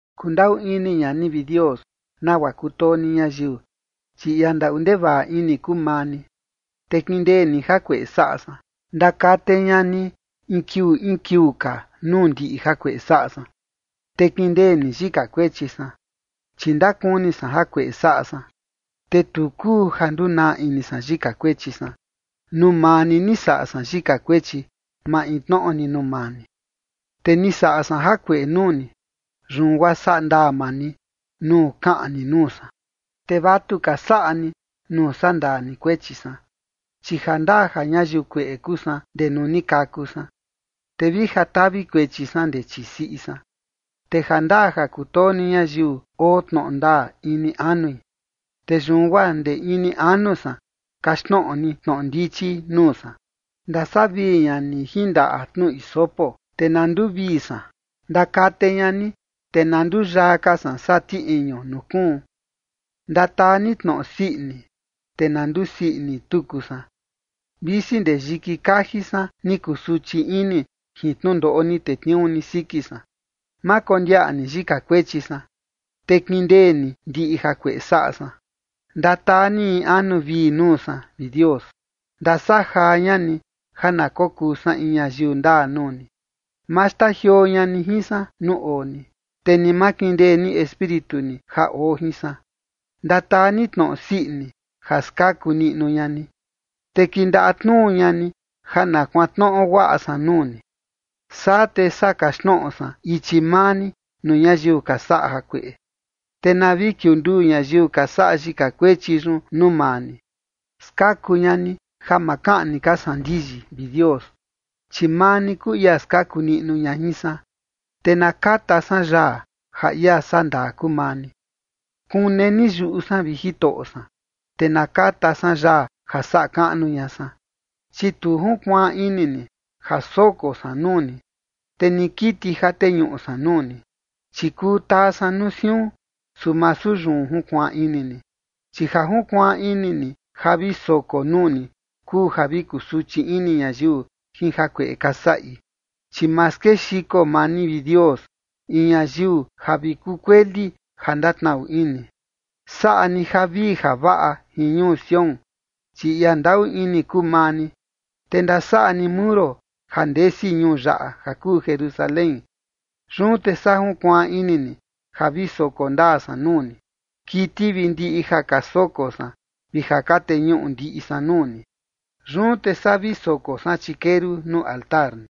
Kundaꞌu ini ña ni, vi Dios, nagua kutoo ni ñayiu, chi ia ndaꞌu ndevaꞌa ini kuu maa ni, te kindee ni jakueꞌe saꞌa san. Ndakate ña ni in kiuu in kiuu ka nuu ndiꞌi jakueꞌe saꞌa san, te kindee ni yika kuechi san. Chi ndakuni san jakueꞌe saꞌa san, te tu kuu ja ndunaa ini san yika kuechi san. Nuu maa ni, ni saꞌa san yika kuechi, maintnoꞌo ni nuu maa ni. Te ni saꞌa san jakueꞌe nuu ni, yun guaa saꞌa ndaa maa ni nuu kaꞌan ni nuu san, te vatuka ka saꞌa ni nuu sandaa ni kuechi san. Chi jandaa ja ñayiu kueꞌe kuu san ndee nuu ni kaku san, te vi ja tavi kuechi san ndee chii siꞌi san. Te jandaa ja kutoo ni ñayiu oo tnoꞌo ndaa ini anui, te yun guaa ndee ini anu san kaxtnoꞌo ni tnoꞌo ndichi nuu san. Ndasavii ña ni jin ndaꞌa tnu hisopo, te na nduvii san. Ndakate ña ni, te na nduyaa ka san saa ti iñu nuu kuun. Ndataa ni tnoꞌo sii ini, te na ndusii ini tuku san, visi ndee yiki kaji san ni kusuchi ini jin tnundoꞌo ni tetniuu ni siki san. Ma kondiaꞌa ni yika kuechi san, te kindee ni ndiꞌi jakueꞌe saꞌa san. Ndataa ni in anu vii nuu san, vi Dios. Ndasajaa ña ni ja na kokuu san in ñayiu ndaa nuu ni. Ma xtajioo ña ni jin san nuu oo ni, te ni ma kindee ni espíritu ni ja oo jin san. Ndataa ni tnoꞌo sii ini, ja skaku niꞌnu ña ni, te kindaꞌa tnuu ña ni ja na kuantnoꞌo guaꞌa san nuu ni. Saa te saa kaxtnoꞌo san ichi maa ni nuu ñayiu ka saꞌa jakueꞌe, te na vi kiunduu ñayiu ka saꞌa yika kuechi yun nuu maa ni. Skaku ña ni ja ma kaꞌni ka san ndiyi, vi Dios, chi maa ni kuu ia skaku niꞌnu ña jin san, te na kata san yaa ja ia sandaa kuu maa ni. Kune ni yuꞌu san, vi Jitoꞌo san, te na kata san yaa ja saꞌa kaꞌnu ña san. Chi tu junkuaan ini ni ja soko san nuu ni, te ni kiti ja teñuꞌu san nuu ni, chi kuu taa san nuu siun, su masu yun junkuaan ini ni. Chi ja junkuaan ini ni ja vi soko nuu ni kuu ja vi kusuchi ini ñayiu jin jakueꞌe ka saꞌi. Chi ma skexiko maa ni, vi Dios, in ñayiu ja vi kukueli ja ndatnaꞌu ini. Saꞌa ni javii javaꞌa jin ñuu Sión, chi ia ndaꞌu ini kuu maa ni, te ndasaꞌa ni muro ja ndesi ñuu yaꞌa ja kuu Jerusalén. Yun te saa junkuaan ini ni ja vi soko ndaa san nuu ni, kiti vi ndiꞌi ja ka soko san vi ja ka teñuꞌu ndiꞌi san nuu ni. Yun te saa vi soko san chikeru nuu altar ni.